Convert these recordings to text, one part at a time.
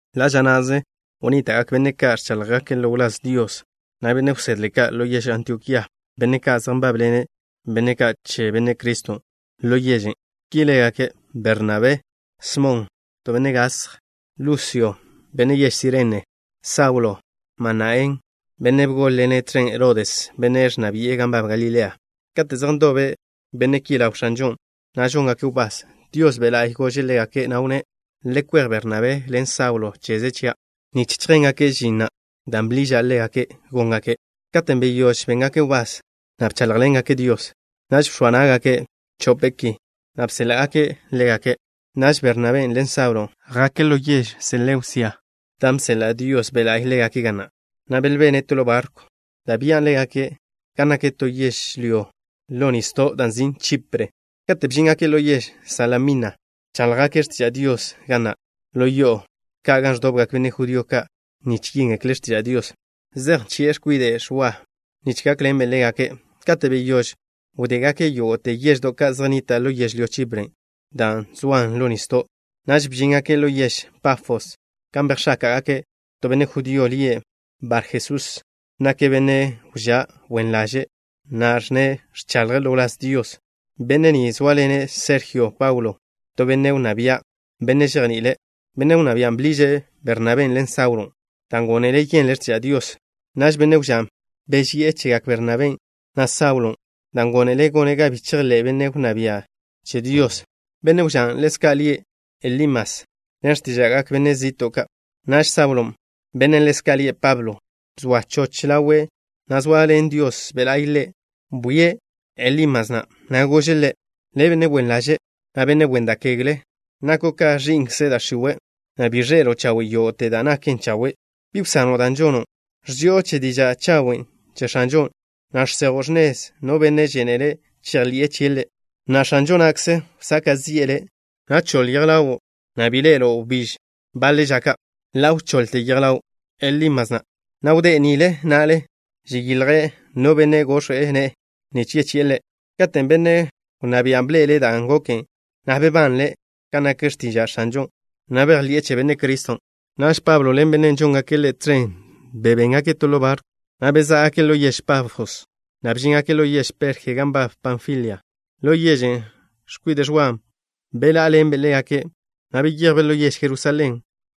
Ḻa' ža na'ze wnníta'gak benne' ka' ẕcháḻjgake' ḻo wláz Dios, na' benne' wsedle ka', ḻo yež Antiokía, benne' ka' zej nbábḻene' benne' ka' che Benne' Criston' ḻo yežen'. Ki lágake': Bernabé, Smon, (ḻezka' lie' Benne' Gasj), Lusio, (benne' yež Sirene), Saulo, Manaén, (benne' bgól-ḻene' tẕen Herodes, benne' ẕnna bi'e gan nbab Galilea). Katen' zej ndobe benne' ki ḻaw X̱anžon', na' žóngake' wbás, Dios Be' La'y gože' ḻégake', na' wnné': —Le kwej Bernabé ḻen Saulo cheze chia' nich chjéngake' žin na' dan' bḻiža' ḻégake' góngaken'. Katen' beyóž béngake' wbás, na' bcháḻjḻengake' Dios, naž bx̱oa ná'gake' chope' ki, na' bséḻa'gake' ḻégake'. Naž Bernabé ḻen Saulo jake' ḻo yež Seleusia dan' bseḻa' Dios Be' La'y ḻégake' ga na', na' belbene' to ḻo barkw da' bchen' ḻégake' gan nak to yežlyó ḻo nisdo' da' nzin' Chipre. Kate' bžíngake' ḻo yež Salamina, bcháḻjgake' x̱tiža' Dios ga nak ḻo yo'o ka' gan ẕdobgak benne' judío ka' nich yéngekle' x̱tiža' Dios. Zej nchi'e x̱kwide' Ẕwa nich gákḻenbe' ḻégake'. Kate' beyóž wdégake' yógo'te yeždo' ka' zej nnitan' ḻo yežlyó Chipren', da' zoan ḻo nisdo', naž bžíngake' ḻo yež Pafos gan bejx̱áka'gake' to benne' judío lie' Barjesús. Nake' benne' wžá' wen ḻaže', na' ẕnne' ẕchaḻje' ḻo wláz Dios. Benne' ni zóaḻene' Serjio Paulo, to benne' wnná bia', benne' žejni'ile'. Benne' wnná bian' bḻiže' Bernabén' ḻen Saulon', dan' gónele' yenle' x̱tiža' Dios. Naž benne' wžán' beži'e chegak Bernabén', na' Saulon', dan' gónele' gone' ga bi chejḻé' benne' wnná bian' che Dios. Benne' wžán' ḻezka' lie' Elimas ḻen x̱tíža'gak benne' zi'to' ka'. Naž Saulon', bennen' ḻezka' lie' Pablo, bzóa choch ḻawe', na' zoaḻen Dios Be' La'y ḻe', bwie' Elímasen', na' gože' ḻe': —Le', benne' wen ḻaže', na' benne' wen da' kegle. Nako' ka ẕi'nkze da' x̱iwe', na' bi ẕḻe'elo' chawe' yógo'te da' naken chawe'. ¿Bi wsano' da' žono', ẕži'o che diža' chawen' che X̱anžon', na' žsejo' x̱nez no benne' žénele' chejḻi'e chie' Ḻe'? Na'a, X̱anžo na'kze wsaka' zi'e le', na' choḻ yej ḻawo', na' bi ḻe'elo' wbíž baḻe ža ka'. Ḻa' wchoḻte yej ḻaw Elímasen', na' wdé' nile na'le, žilje' no benne' gox̱we' ne'e, nich wchi'e ḻe'. Katen' benne' wnná bian' bḻe'ele' da' goken, na' bebanle' kan nak x̱tiža' X̱anžon', na' bejḻi'e che Benne' Criston'. Naž Pablo ḻen benne' ka' žónḻengake' ḻe' tẕen wžéngake' to ḻo barkw, na' bezá'gake' ḻo yež Pafos, na' bžíngake' ḻo yež Perje gan nbab Panfilia. Ḻo yežen' x̱kwide' Ẕwa bḻá'aḻenbe' ḻégake', na' beyejbe' ḻo yež Jerusalén.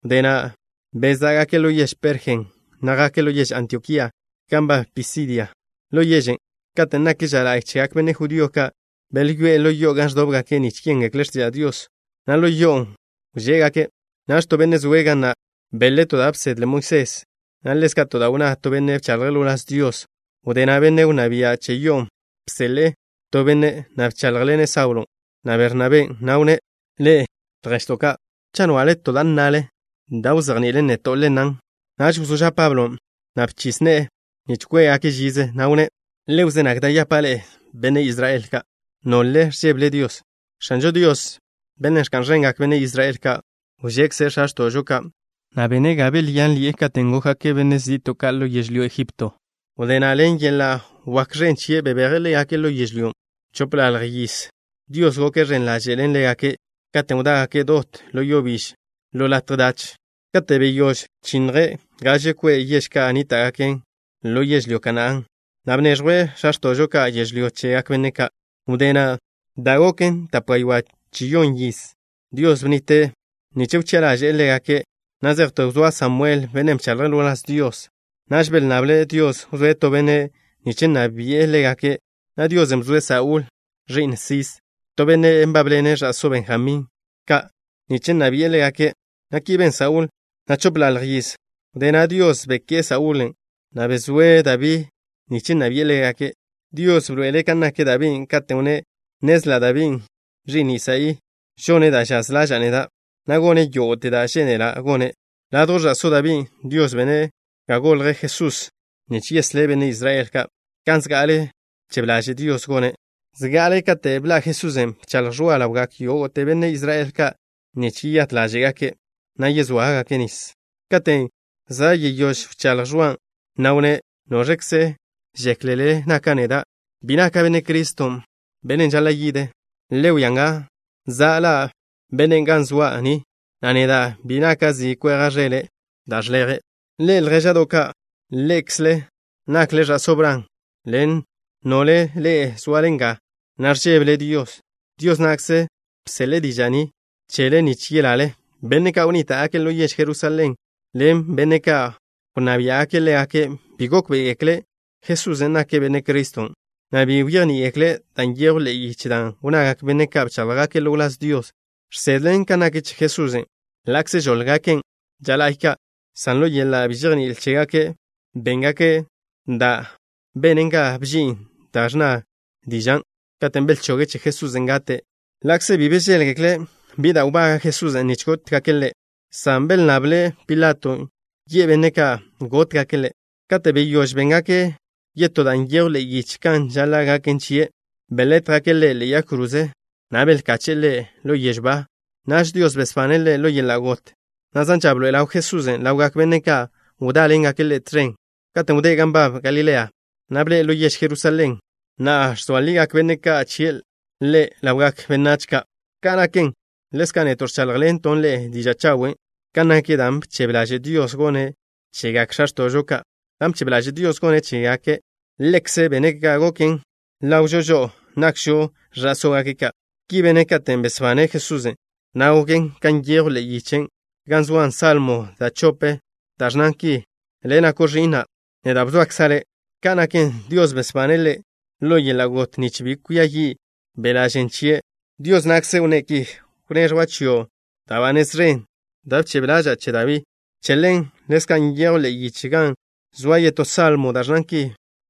Wdé na' bezá'gake' ḻo yež Perjen', na' jake' ḻo yež Antiokía gan nbab Pisidia. Ḻo yežen', katen' nak ža la'y chegak benne' judío ka', belyoé'e ḻo yo'o gan ẕdóbgake' nich yéngekle' x̱tiža' Dios, na' ḻo yo'on' wžé'gake'. Naž to benne' zoe' ga na' beḻe' to da' bsedle Moisés, na' ḻezka' to da' wnná to benne' bchaḻje' ḻo wláz Dios. Wdé na' benne' wnná bia' che yo'on' bseḻe'e to benne', na' bcháḻjḻene' Saulon', na' Bernabén', na' wnné': —Ḻe'e, lježto' ka'. Cha' nche'le to da' nnale da' wzejni'ilen neto', le nnan. Naž wzó ža' Pablon', na' bchis ne'e nich kwé'gake' žize, na' wnné': —Le wzé nag da' yapa' ḻe'e, benne' Israel ka', na' ḻe'e, nole ẕžébele Dios. X̱anžo Dios, Bennen' ẕka'n ẕengak benne' Israel ka', wžekze' x̱a x̱to'žo ka', na' bene' ga belyánḻi'e katen' gókgake' benne' zi'to' ka' ḻo yežlyó Ejipto. Wdé na' ḻen yeḻa' wak ẕen chie' bebeje' ḻégake' ḻo yežlyón'. Chopḻalj yiz Dios goke' ẕen ḻaže' ḻen ḻégake' katen' wdágake' dot ḻo yo biž ḻo latje dach. Kate' beyóž bchinnje' gaže kwe' yež ka' wnníta'gaken ḻo yežlyó Kanaán, na' bneẕjwe' x̱a x̱to'žo ka' yežlyó chegak benne' ka'. Wdé na', da' goken tape gaywá' chi yon yiz, Dios bnnite' benne' ka' nich wchi'a ḻaže'e ḻégake' na' zejte wzóa Samuel, bennen' bchaḻje' ḻo wláz Dios. Naž belnnable' Dios wzóe' to benne' nich nna bi'e ḻégake', na' Dios bzoe' Saúl, ẕi'n Sis, to benne' nbábḻene' ẕa'só Benjamín ka' nich nna bi'e ḻégake', na' ki ben Saúl na' chopḻalj yiz. Wdé na' Dios beké'e Saúl na', na' bzoe' Dabí nich nna bi'e ḻégake'. Dios bḻoe'ele' kan nak Dabín', katen' wnné': “Nnezla' Dabí, ẕi'n Isaí, žone' da' žaz ḻaža'a neda', na' gone' yógo'te da' žénela' gone'.” Ladjw ẕa'só Dabín', Dios bene' ga golj Jesusen' nich yeslé' benne' Israel ka', kan zga'ale bchebe ḻaže' Dios gone'. Zga'ale kate' bḻa' Jesusen', bchaḻj Ẕwa ḻawgak yógo'te benne' Israel ka' nich yeyát ḻáže'gake', na' yezóagake' nis. Katen' za' yeyóž wcháḻj Ẕwan', na' wnné': “¿Noẕkze žéklele naka' neda'? Bi naka' Benne' Criston', Bennen' žaḻa' yide'. Le wia nga. Za' ḻa' Bennen' ga zoa' ni, na' neda' bi naka' zi kweja' ẕele' da' žleje'.” ’Ḻe'e, ljéža'do' ka', ḻe'ekzle nakle ẕa'só Bran ḻen nole ḻe'e zoale nga, na' ẕžébele Dios. Dios na'kze bseḻe'e diža' ni chele nich yelale. Benne' ka' wnníta'gake' ḻo yež Jerusalén ḻen benne' ka' wnná biá'gake' ḻégake', bi gókbe'egekle' Jesusen' nake' Benne' Criston', na' bi bejní'igekle' da' nyejw ḻe'e yiche dan' wnnagak benne' ka' bcháḻjgake' ḻo wláz Dios, žsedlen kan nak che Jesusen', ḻa'kze žóḻgaken' ža la'y ka', san ḻo yeḻa' bi žejní'il chégake' béngake' da' benen ga bžin dan' ẕnna dižan' katen' belchoge' che Jesusen' gate'. Ḻa'kze bi bžéḻgekle' bi da' nbaga' Jesusen' nich chóggake' chie' gate', san belnnable' Pilato yi'e benne' ka' gótgake' Ḻe'. Kate' beyóž béngake' yógo'te da' nyejw ḻe'e yiche kan žaḻa' gaken chie', belétjgake' Ḻe' ḻe'e yag kroze, na' belkache'e Ḻe' ḻo yežw ba. Naž Dios besbane' Ḻe' ḻo yeḻa' got, na' zan ža bḻoe'e ḻaw Jesusen' ḻawgak benne' ka' wdáḻengake' Ḻe' tẕen katen' wdé' gan nbab Galilea, na' bḻe'e ḻo yež Jerusalén. Na'a, ẕzoa ligak benne' ka' chie' Ḻe' ḻawgak benách ka'. ’Ka' naken, ḻezka' neto' ẕcháḻjḻento' ḻe'e diža' chawen' kan nak dan' bchebe ḻaže' Dios gone' chegak x̱a x̱to'žo ka'. Dan' bchebe ḻaže' Dios gone' chégake', Ḻekze' bene' ga goken ḻawžo žo'o, nakžo ẕa'sógake' ka'. Ki bene' katen' besbane' Jesusen', na' goken kan nyejw ḻe'e yiche gan zoa salmo da' chopen', dan' ẕnnan ki: “Le' nako' Ẕi'na'. Neda' bzoakza' Le'.” Ka naken, Dios besbane' Ḻe' ḻo yeḻa' got nich bi kwia yi' beḻa' žen chie', Dios na'kze wnné' ki: “Wneẕjwa' chio' da' ba nez ẕen da' bchebe ḻaža'a che Dabí.” Che ḻen ḻezka' nyejw ḻe'e yiche, gan zoa yetó salmo, da' ẕnnan ki: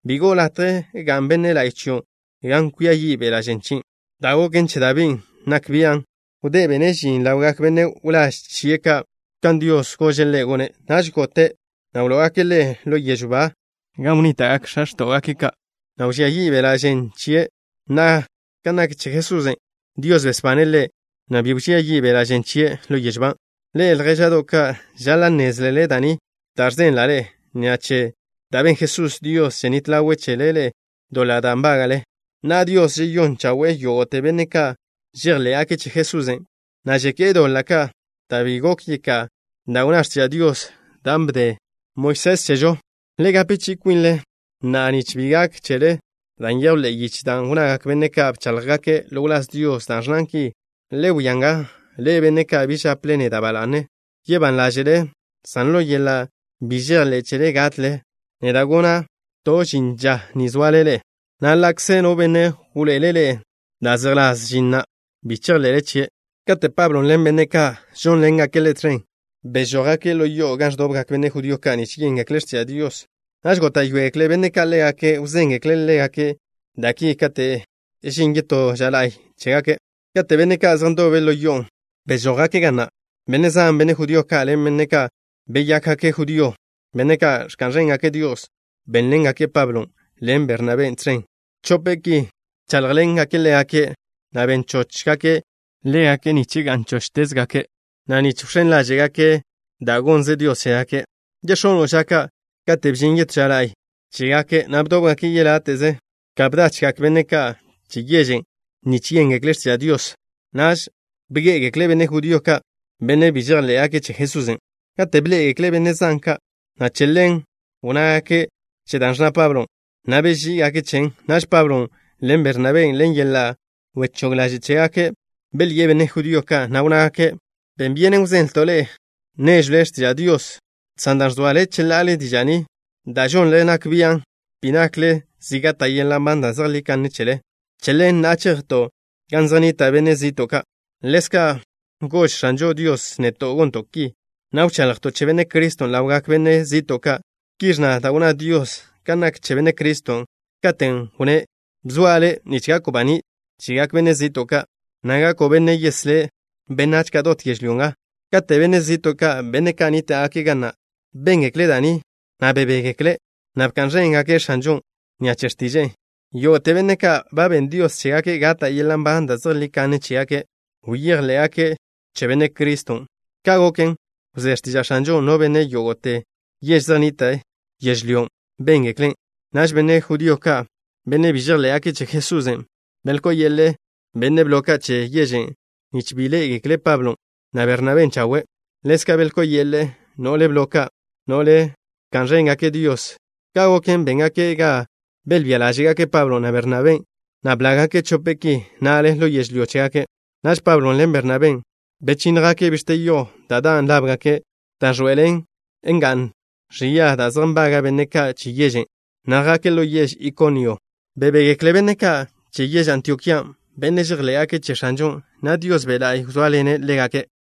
“Bi go'o latje ga'n benne' la'y chio' gan kwia yi' beḻa' žen chie'.” Da' goken che Dabín' nak bian'. Wdé bene' žin ḻawgak benne' wláž chie' ka', kan Dios gože' ḻe' gone', naž gote', na' wló'ogake' ḻe' ḻo yežw ba gan wnníta'gak x̱a x̱ta'we' ka', na' wẕía yi' beḻa' žen chie'. Na'a, kan nak che Jesusen', Dios besbane' Ḻe', na' bi wẕía yi' beḻa' žen chie' ḻo yežw ba. Ḻe'e, ljéža'do' ka', žaḻa' nnézlele da' ni da' ẕzenla' ḻe'e. Ni'a che da' ben Jesusen' Dios ženít ḻawe' chele ḻe'e doḻa' da' nbága'le. Na'a, Dios žeyón chawe'e yógo'te benne' ka' žejḻé'gake' che Jesusen', na' žeké'e doḻa' ka' da' bi gok yeká'a da' wnná x̱tiža' Dios, dan' bde Moisés chežo. Le gape chi'i kwinle na'a nich bi gak chele da' nyejw ḻe'e yiche dan' wnnagak benne' ka' bcháḻjgake' ḻo wláz Dios, da' ẕnnan ki: Le wia nga, ḻe'e, benne' ka' bi žaple neda' ba la'ne. Yebán ḻáže'le, san ḻo yeḻa' bi žejḻé' chele gatle. Neda' gona' to žin ža ni zoale ḻe'e, na' ḻa'kze no benne' wḻoe'ele' ḻe'e da' zejḻás žin na', bi chejḻe'le chie'. Kate' Pablon' ḻen benne' ka' žónḻengake' ḻe' tẕen bežójgake' ḻo yo'o gan ẕdobgak benne' judío ka' nich yéngekle' x̱tiža' Dios, naž góta'yoegekle benne' ka' ḻégake' wzéngekle' ḻégake' da' ki kate' žin yetó ža la'y chégake'. Kate' benne' ka' zej ndobe' ḻo yo'on', bežójgake' ga na', benne' zan, benne' judío ka', ḻen benne' ka' beyákgake' judío, benne' ka' ẕka'n ẕéngake' Dios, bénḻengake' Pablon' ḻen Bernabén' tẕen. Chope' ki bcháḻjḻengake' ḻégake', na' ben chóchgake' ḻégake' nich gá'nteze chóchgake', na' nich wx̱én ḻáže'gake' da' gonnze Dios chégake'. Yex̱ono' ža ka' katen' bžin yetó ža la'y chégake', na' bdobgak yeláte'ze ka bdachgak benne' ka' che yežen' nich yéngekle' x̱tiža' Dios. Naž bgé'egekle benne' judío ka', benne' bi žejḻé'gake' che Jesusen', kate' bḻé'egekle' benne' zan ka', na' che ḻen wnnégake' che da' ẕnna Pablon', na' beží'igake' chen. Naž Pablon' ḻen Bernabén', ḻen yeḻa' wechóg ḻaže' chégake', belyi'e benne' judío ka', na' wnnágake': —Ben byenen wzenlto' ḻe'e néžwle x̱tiža' Dios, san dan' ẕzoale cheḻa'ale diža' ni, da' žonle nak bian' bi nakle zi gata' yeḻa' nban da' zejlí kanne ni chele, che ḻen, na'a chejto' gan zej nnita' benne' zi'to' ka'. Ḻezka' gož X̱anžo Dios neto' gonto' ki, na' wchaḻjto' che Benne' Criston' ḻawgak benne' zi'to' ka'. Ki ẕnna da' wnná Dios kan nak che Benne' Criston', katen' wnné': Bzoa' Le' nich gako' baní' chegak benne' zi'to' ka', na' gako' Benne' yeslé' benách ka' dot yežlyó nga. Kate' benne' zi'to' ka', benne' ka' nníta'gake' ga na', béngekle' da' ni, na' bebégekle', na' bka'n ẕéngake' X̱anžon' ni'a che x̱tiže'e. Yógo'te benne' ka' ba ben Dios chégake' gata' yeḻa' nban da' zejlí kanne chégake', bejḻé'gake' che Benne' Criston'. Ka' goken, wzé x̱tiža' X̱anžon', na' benne' yógo'te yež zej nnitan' yežlyón', béngeklen'. Naž benne' judío ka', benne' bi žejḻé'gake' che Jesusen', belkó'o yeḻe'e benne' blo ka' che yežen' nich bi ḻé'egekle' Pablon', na' Bernabén' chawe'. Ḻezka' belkó'o yeḻe'e no'le blo ka', no'le ẕka'n ẕéngake' Dios. Ka' goken, béngake' ga belbía ḻáže'gake' Pablon', na' Bernabén', na' blággake' chope' ki na'le ḻo yežlyó chégake'. Naž Pablon' ḻen Bernabén', bechínnjgake' bix̱te yo da' dan' lábgake', dan' ẕḻoe'elen nga'n ẕia da' zej nbaga' benne' ka' che yežen', na' jake' ḻo yež Ikonio. Bebégekle benne' ka' che yež Antiokía, benne' žejḻé'gake' che X̱anžon', na' Dios Be' La'y wzóaḻene' ḻégake'.